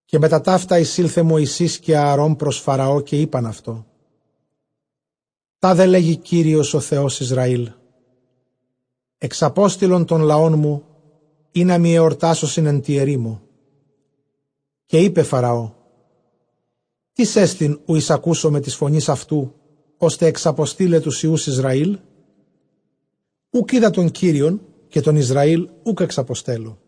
Καὶ μετὰ ταῦτα εἰσῆλθε Μωυσῆς καὶ Ἀαρὼν πρὸς Φαραὼ, καὶ εἶπαν αὐτῷ, τάδε λέγει Κύριος ὁ Θεὸς Ἰσραὴλ, ἐξαπόστειλον τὸν λαόν μου, ἵνα μοι ἑορτάσωσιν ἐν τῇ ἐρήμῳ. Καὶ εἶπε Φαραὼ, τίς ἐστιν οὗ εἰσακούσομαι τῆς φωνῆς αὐτοῦ, ὥστε ἐξαποστεῖλαι τοὺς υἱοὺς Ἰσραήλ; οὐκ οἶδα τὸν Κύριον, καὶ τὸν Ἰσραὴλ οὐκ ἐξαποστέλλω.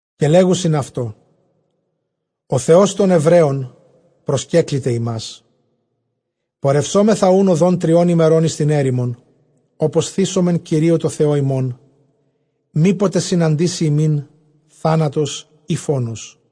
Καὶ λέγουσιν αὐτῷ, ὁ Θεὸς τῶν Ἐβραίων προσκέκληται ἡμᾶς· πορευσόμεθα οὖν ὁδὸν τριῶν ἡμερῶν εἰς τὴν ἔρημον, ὅπως θύσωμεν Κυρίῳ τῷ Θεῷ ἡμῶν, μή ποτε συναντήσῃ ἡμῖν θάνατος ἢ φόνος.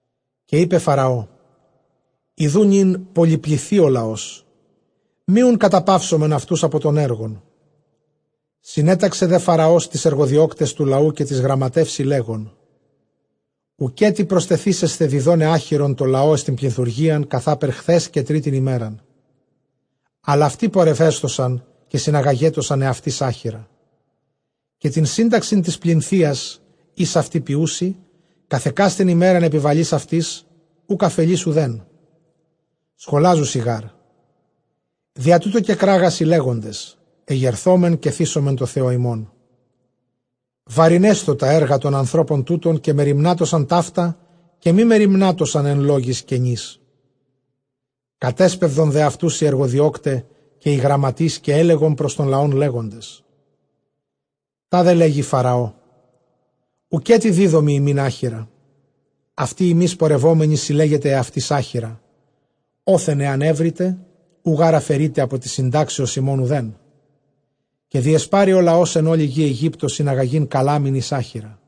Καὶ εἶπεν Φαραὼ, ἰδοὺ νῦν πολυπληθεῖ ὁ λαὸς, μὴ οὖν καταπαύσωμεν αὐτοὺς ἀπὸ τῶν ἔργων. Συνέταξε δὲ Φαραὼ τοῖς ἐργοδιώκταις τοῦ λαοῦ, καὶ τοῖς γραμματεῦσι, λέγων, οὐκέτι προστεθήσεσθε διδόναι ἄχυρον τῷ λαῷ εἰς τὴν πλινθουργίαν, καθάπερ χθὲς καὶ τρίτην ἡμέραν· ἀλλ αὐτοὶ πορευέσθωσαν καὶ συναγαγέτωσαν ἑαυτοῖς ἄχυρα. Καὶ τὴν σύνταξιν τῆς πλινθείας, ἧς αὐτοὶ ποιοῦσι, καθʼ ἑκάστην ἡμέραν ἐπιβαλεῖς αὐτοῖς· οὐκ ἀφελεῖς οὐδέν· σχολάζουσι γάρ· διὰ τοῦτο κεκράγασι, λέγοντες, ἐγερθῶμεν, καὶ θύσωμεν τῷ Θεῷ ἡμῶν. Βαρυνέσθω τὰ ἔργα τῶν ἀνθρώπων τούτων, καὶ μεριμνάτωσαν ταῦτα, καὶ μὴ μεριμνάτωσαν ἐν λόγοις κενοῖς. Κατέσπευδον δὲ αὐτοὺς οἱ ἐργοδιῶκται καὶ οἱ γραμματεῖς, καὶ ἔλεγον πρὸς τὸν λαὸν, λέγοντες, τάδε λέγει Φαραὼ, οὐκέτι δίδωμι ὑμῖν ἄχυρα. Αὐτοὶ ὑμεῖς πορευόμενοι συλλέγετε ἑαυτοῖς ἄχυρα, ὅθεν ἐὰν εὕρητε· οὐ γὰρ ἀφαιρεῖται ἀπὸ τῆς συντάξεως ὑμῶν οὐθέν. Καὶ διεσπάρη ὁ λαὸς ἐν ὅλῃ γῇ Αἰγύπτῳ συναγαγεῖν καλάμην εἰς ἄχυρα.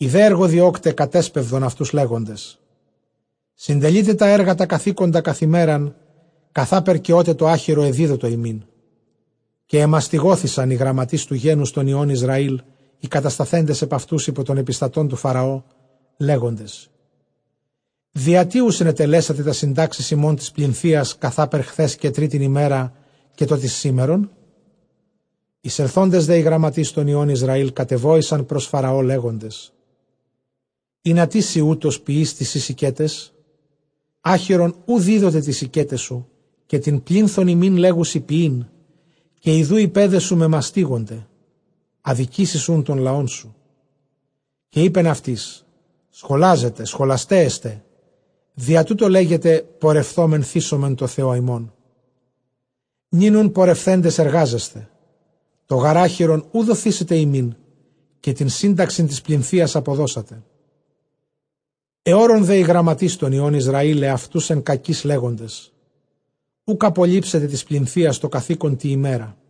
Οἱ δὲ ἐργοδιῶκται κατέσπευδον αὐτοὺς, λέγοντες, συντελεῖτε τὰ ἔργα τὰ καθήκοντα καθʼ ἡμέραν, καθάπερ καὶ ὅτε τὸ ἄχυρον ἐδίδοτο ὑμῖν. Καὶ ἐμαστιγώθησαν οἱ γραμματεῖς τοῦ γένους τῶν υἱῶν Ἰσραὴλ, οἱ κατασταθέντες ἐπʼ αὐτοὺς, ὑπὸ τῶν ἐπιστατῶν τοῦ Φαραὼ, λέγοντες, διατί οὐ συνετελέσατε τὰς συντάξεις ὑμῶν τῆς πλινθείας καθάπερ χθὲς καὶ τρίτην ἡμέραν, καὶ τὸ τῆς σήμερον; Εἰσελθόντες δὲ οἱ γραμματεῖς τῶν υἱῶν Ἰσραὴλ κατεβόησαν πρὸς Φαραὼ, λέγοντες, ἱνατί σὺ οὕτως ποιεῖς τοῖς σοῖς οἰκέταις; Ἄχυρον οὐ δίδοται τοῖς οἰκέταις σου, καὶ τὴν πλίνθον ἡμῖν λέγουσι ποιεῖν· καὶ ἰδοὺ οἱ παῖδές σου μεμαστίγωνται, ἀδικήσεις οὖν τὸν λαόν σου. Καὶ εἶπεν αὐτοῖς, σχολάζετε, σχολασταί ἐστε· διὰ τοῦτο λέγετε, πορευθῶμεν, θύσωμεν τῷ Θεῷ ἡμῶν. Νῦν οὖν πορευθέντες, ἐργάζεσθε· τὸ γὰρ ἄχυρον οὐ δοθήσεται ὑμῖν, καὶ τὴν σύνταξιν τῆς πλινθείας ἀποδώσετε. Ἑώρων δὲ οἱ γραμματεῖς τῶν υἱῶν Ἰσραὴλ ἑαυτοὺς ἐν κακοῖς, λέγοντες, οὐκ ἀπολείψετε τῆς πλινθείας τὸ καθῆκον τῇ ἡμέρᾳ.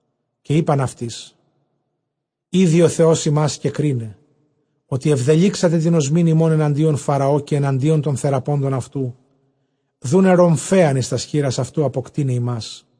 Καὶ εἶπαν αὐτοῖς, ἴδοι ὁ Θεὸς ὑμᾶς καὶ κρίναι, ὅτι ἐβδελύξατε τὴν ὀσμὴν ἡμῶν ἐναντίον Φαραὼ, καὶ ἐναντίον τῶν θεραπόντων αὐτοῦ, δοῦναι ῥομφαίαν εἰς τὰς χεῖρας αὐτοῦ, ἀποκτεῖναι ἡμᾶς.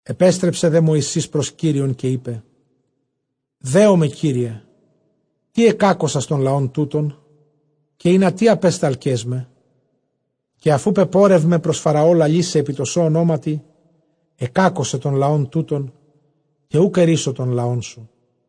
Ἐπέστρεψε δὲ Μωυσῆς πρὸς Κύριον, καὶ εἶπε, δέομαι, Κύριε· τί ἐκάκωσας τὸν λαὸν τοῦτον; καὶ ἱνατί ἀπέσταλκάς με; Καὶ ἀφʼ οὗ πεπόρευμαι πρὸς Φαραὼ, λαλῆσαι ἐπὶ τῷ σῷ ὀνόματι, ἐκάκωσε τὸν λαὸν τοῦτον· καὶ οὐκ ἐῤῥύσω τὸν λαόν σου.